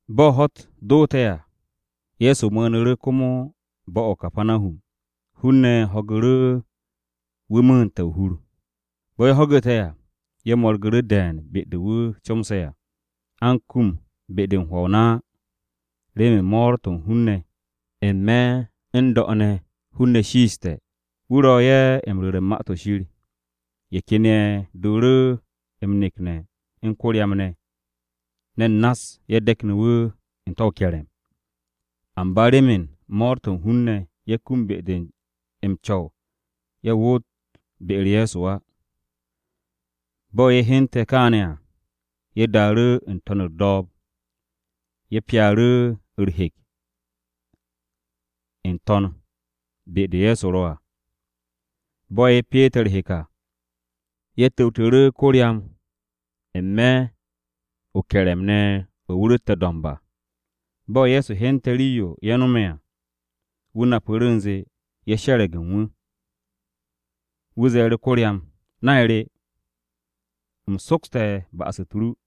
Bo̱ ho̱-u̱t doote̱ à, Ye̱so mu̱u̱nu̱ru̱ komo bo̱-o̱ o-Kapanahum. Hun-ne̱ ho̱gu̱ru̱ wu̱ mu̱u̱nte̱ o-hur. Bo̱ ye̱ ho̱gu̱te̱ à, ye̱ mo̱rgu̱ru̱ de̱e̱n be-de wu̱ comse̱ à. A u̱n kum be-de u̱n hwo̱ o-na á, remen mo̱o̱r-to̱ u̱n hun-ne̱. N-me̱ n-do̱ ne̱ hun-ne̱ shiiste̱. Wu̱ ro ye̱ m-ru̱re̱ u̱n Ma-to̱ Shir. Ye̱ ken ye̱ dooru̱ m-nekne̱ u̱n ko-ryam ne̱. Ne̱n nass-ye̱ de̱kne̱ wu̱ n-te̱ o-ke̱re̱m. Amba remen mo̱o̱r-to̱ u̱n hun-ne̱, ye̱ kum be-de m-co̱w ye̱ woot be-u̱r Ye̱so á. Bo̱ ye̱ hyente̱ kaane̱ à, ye̱ daaru̱ n-to̱n u̱r-do̱o̱b, ye̱ pyaaru̱ u̱r-hek n-to̱n be-de Ye̱so ro̱ à. Bo̱ ye̱ pyeete̱ u̱r-hek à, ye̱ tu̱wtu̱ru̱ ko-ryam n-me̱ o-ke̱re̱m ne̱ o̱ wu̱ ro̱tte̱ do̱mb à. Bo̱ Ye̱so hyente̱ rii-yo ye̱ no̱me̱ à, wu̱ napu̱ru̱ u̱nze ye̱ she̱re̱g u̱n wu̱. Wu̱ ze̱e̱ru̱ ko-ryam, “Nay re, u̱m sokste̱ ba'as-u̱t ru.”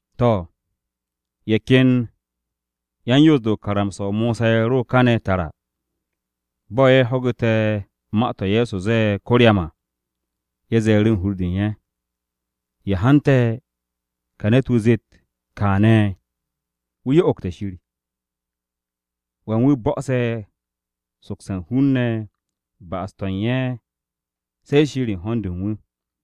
To̱, ye̱ ken yan-Yoos-de u̱n karamsa-o Mosa ye̱ ro kane̱ tara. Bo̱ ye̱ ho̱gu̱te̱ ma-to̱ Ye̱so ze̱e̱ ko-ryam à, ye̱ ze̱e̱ru̱ u̱n hur-de u̱n ye̱, “¿Ya hante̱ ka ne̱t-wu̱ zeet kaane̱? Wu̱ yo'ogte̱ Shir. Wan wu̱ bo̱'o̱se̱ sokse̱ u̱n hun-ne̱ ba'as-to̱ u̱n ye̱ se̱ Shir u̱n ho̱n-de u̱n wu̱.”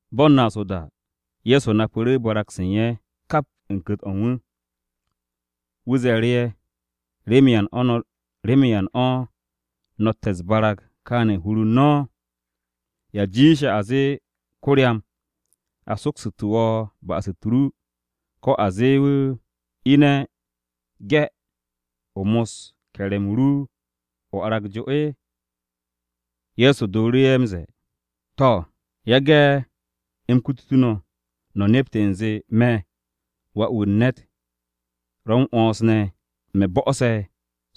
Ba u̱n naas o-da, Ye̱so napu̱ru̱ barag-se u̱n ye̱ kap u̱n ku̱t-o̱ u̱n wu̱. Wu̱ ze̱e̱ru̱ ye̱, “¿Remen yan o̱ no̱tte̱ u̱s-barag kaane̱ u̱n hur u̱n no̱? ¿Ya jiishe̱, a zee ko-ryam ‘A soksu̱tu̱ wo̱ ba'as-u̱t ru,’ ko̱ a zee wu̱, ‘Ine̱ ge̱, o mos ke̱re̱m-o ru, o arag jo’?” Ye̱so dooru̱ ye̱ m-ze̱e̱, “To̱, yage̱ u̱m kutu no̱, no̱ nept u̱nze me̱ Wà-wu̱ u̱n ne̱t ro̱ m-'wo̱ns ne̱, me̱ bo̱'o̱se̱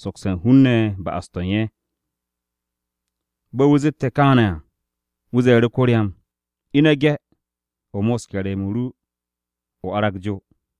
sokse̱ u̱n hun-ne̱ ba'as-to̱ u̱n ye̱.” Bo̱ wu̱ zette̱ kaane̱ à, wu̱ ze̱e̱ru̱ ko-ryam, “Ine̱ ge̱, o mos ke̱re̱m-o ru, o arag jo.”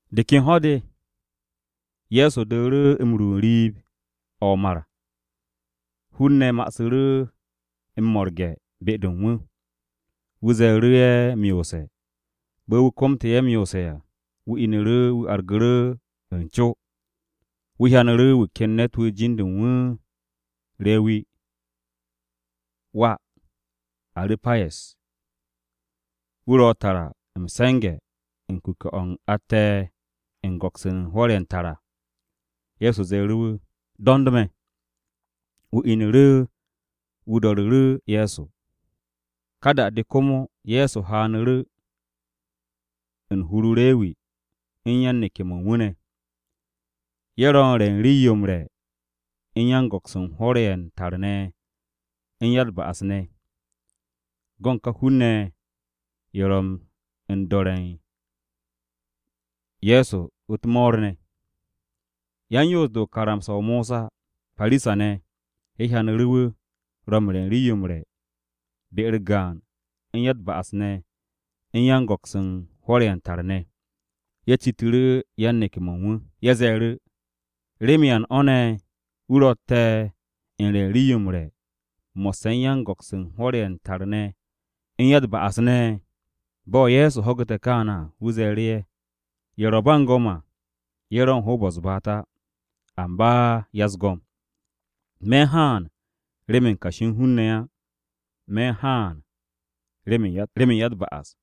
De ken ho̱-de, Ye̱so dooru̱ m-ru n-riib o̱ o-mar. Hun-ne̱ ma'asu̱ru̱ m-mo̱rge̱ be-de u̱n wu̱. Wu̱ ze̱e̱ru̱ ye̱ m-yoose̱. Bo̱ wu̱ komte̱ ye̱ m-yoose̱ à, wu̱ inu̱ru̱ wu̱ argu̱ru̱ u̱n co. Wu̱ hyanu̱ru̱ wu̱ ken ne̱t-wu̱ jin-de u̱n wu̱ Rewi (wà Aru̱payes). Wu̱ ro̱ tara m-se̱nge̱ u̱n kuke̱-o̱ atte̱ u̱n go̱ks u̱n hwo̱r-ye̱ u̱n tar à. Ye̱so ze̱e̱ru̱ wu̱, “Do̱nd me̱.” Wu̱ inu̱ru̱, wu̱ do̱ru̱ru̱ Ye̱so. Ka da-de, komo Ye̱so haanu̱ru̱ u̱n hur-o Rewi u̱n yan-neke̱-mo̱ u̱n wu̱ ne̱. Ye̱ ro̱ u̱n re̱ u̱n rii-yo m-re̱ u̱n yan-go̱ks u̱n hwo̱r-ye̱ u̱n tar ne̱ u̱n ya-u̱t-ba'as ne̱. Go̱n ka hun-ne̱ ye̱, ye̱ ro̱ u̱n do̱re̱ u̱n Ye̱so u̱t-mo̱o̱r ne̱. Yan-Yoos-de u̱n karamsa-o MosaParisa-ne̱, ye̱ hyanu̱ru̱ wu̱ ro̱ m-re̱ u̱n rii-yo m-re̱ be-u̱r gaan u̱n ya-u̱t-ba'as ne̱ u̱n yan-go̱ks u̱n hwo̱r-ye̱ u̱n tar ne̱. Ye̱ citu̱ru̱ yan-neke̱-mo̱ u̱n wu̱. Ye̱ ze̱e̱ru̱, “¿Remen yan o̱ ne̱ wu̱ ro̱tte̱ u̱n re̱ u̱n rii-yo m-re̱ mo̱sse̱ u̱n yan-go̱ks u̱n hwo̱r-ye̱ u̱n tar ne̱ u̱n ya-u̱t-ba'as ne̱?” Bo̱ Ye̱so ho̱gu̱te̱ kaane̱ à, wu̱ ze̱e̱ru̱ ye̱, “Ye̱ ro̱ ba u̱n go̱m à ye̱ u̱n hoob-o̱ u̱n ko-ya-u̱s-baat á, amba ya-u̱s-go̱m. Me̱ u̱n haan remen kashi u̱n hun-ne̱ á. Me̱ u̱n haan remen ya-u̱t-ba'as.”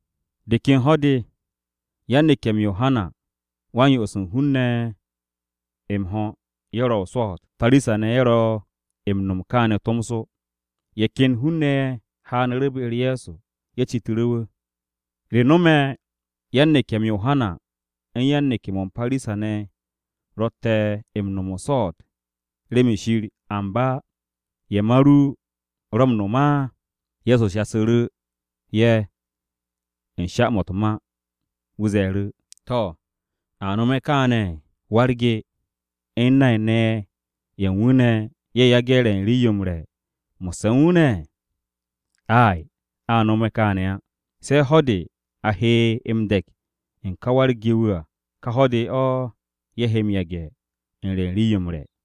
De ken ho̱-de, yan-neke̱-m Yohana Wa-m-Yo'os u̱n hun-ne̱ m-ho̱ ye̱ ro̱ o-swo̱o̱t. Parisa-ne̱ ye̱ ro̱ m-no̱m kaane̱ tomso. Ye̱ ken hun-ne̱ ye̱ haanu̱ru̱ be-u̱r Ye̱so, ye̱ citu̱ru̱ wu̱, “¿Re no̱me̱ yan-neke̱-m Yohana u̱n yan-neke̱-mo̱ u̱n Parisa-ne̱ ro̱tte̱ m-no̱m o-swo̱o̱t remen Shir, amba ye̱ ma ru ro̱ m-no̱m á?” Ye̱so shasu̱ru̱ ye̱ u̱n sha-mo̱ u̱t-ma, wu̱ ze̱e̱ru̱, “To̱, ¿a nome̱ kaane̱? ¿Wa-u̱r-ge u̱n nay-ne̱ ye̱ u̱n wu̱ ne̱ ye̱ yage̱ re̱ u̱n rii-yo m-re̱ mo̱sse̱ u̱n wu̱ ne̱? Ay, a nome̱ kaane̱ á. Se̱ de̱ ho̱-de a he m-de̱k u̱n ka wa-u̱r-ge-wu̱ à, ka ho̱-de o̱ ye̱ he m-yage̱ u̱n re̱ u̱n rii-yo m-re̱.”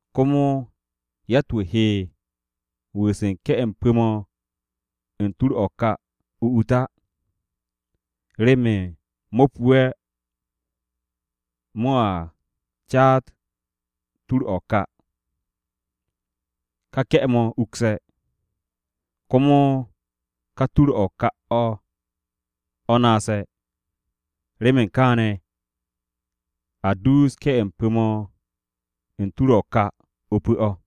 Komo yatt-wu̱ he wu̱u̱s m-ke̱ m-pu̱ mo̱ u̱n tur-o̱ o-ka o-ut á, remen mo̱ pu'e̱ mo̱a caat tur-o̱ o-ka. Ka ke̱-mo̱ ukse̱, komo ka tur-o̱ o-ka o̱ naase̱. Remen kaane̱, a duus ke̱-m pu̱-mo̱ u̱n tur-o̱ o-ka o-pu̱ o̱.”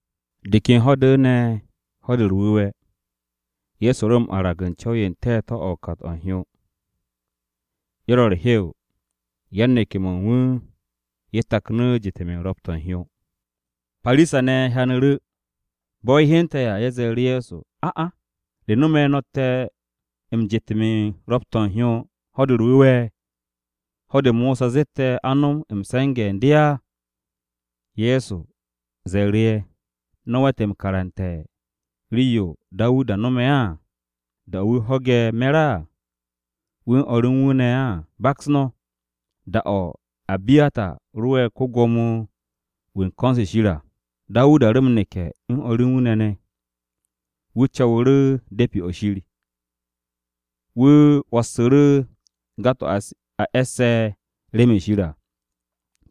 De ken ho̱-de ne̱, Ho̱-de u̱r-Wu̱we̱, Ye̱so ro m-arag u̱n co̱w n-te̱te̱ o̱ u̱n kat-o̱ u̱n hyo. Ye̱ ro̱ u̱r-hew, yan-neke̱-mo̱ u̱n wu̱ ye̱ taknu̱ m-jet u̱n ro̱p-to̱ u̱n hyo. Parisa-ne̱ hyanu̱ru̱. Bo̱ ye̱ hyente̱ à, ye̱ ze̱e̱ru̱ Ye̱so, “A'a, ¿re no̱me̱ no̱tte̱ m-jet u̱n ro̱p-to̱ u̱n hyo Ho̱-de u̱r-Wu̱we̱? ¿Ho̱-de Mosa zette̱ a nom m-se̱nge̱ u̱n de á?” Ye̱so ze̱e̱ru̱ ye̱, “¿No̱ we̱t m-karante̱ rii-yo Dawuda nome̱ á? ¿Da-o̱ wu̱ ho̱ge̱ me̱r à, wu̱ u̱n o̱r u̱n wu̱ ne̱ à? Baks no̱. Da-o̱ Abiyata ro'e̱ ko-Gwo̱mo-wu̱ u̱n ko̱n-se Shir à, Dawuda ro m-neke̱ u̱n o̱r u̱n wu̱ ne̱ ne̱. Wu̱ co̱wu̱ru̱ De̱pi-o̱ Shir. Wu̱ 'wo̱ssu̱ru̱ ga-to̱ a e̱sse̱ remen Shir à,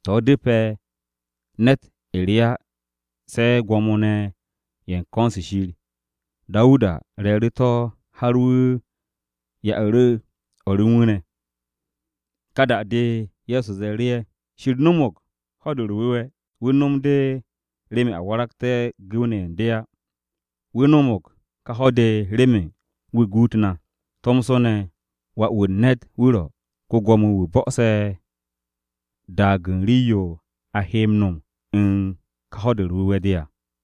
to̱ u̱depe̱ ne̱t re á se̱ yan-Co̱w u̱n ko̱n-se Shir, Dawuda re̱e̱ru̱ to̱ har wu̱ ya'u̱ru̱ o̱r u̱n wu̱ ne̱.” Ka da-de, Ye̱so ze̱e̱ru̱ ye̱, “Shir no̱mo̱g Ho̱-de u̱r-Wu̱we̱, wu̱ no̱m de remen a waragte̱ gu̱w-ne̱ ye̱ u̱n de á. Wu̱ no̱mo̱g ka ho̱-de, remen wu̱ guut na. Tomso ne̱, Wà-wu̱ u̱n ne̱t, wu̱ ro̱ ko-gwo̱mo-wu̱ bo̱'o̱se̱ daag u̱n rii-yo a he m-no̱m u̱n ka Ho̱-de u̱r-Wu̱we̱ de à.”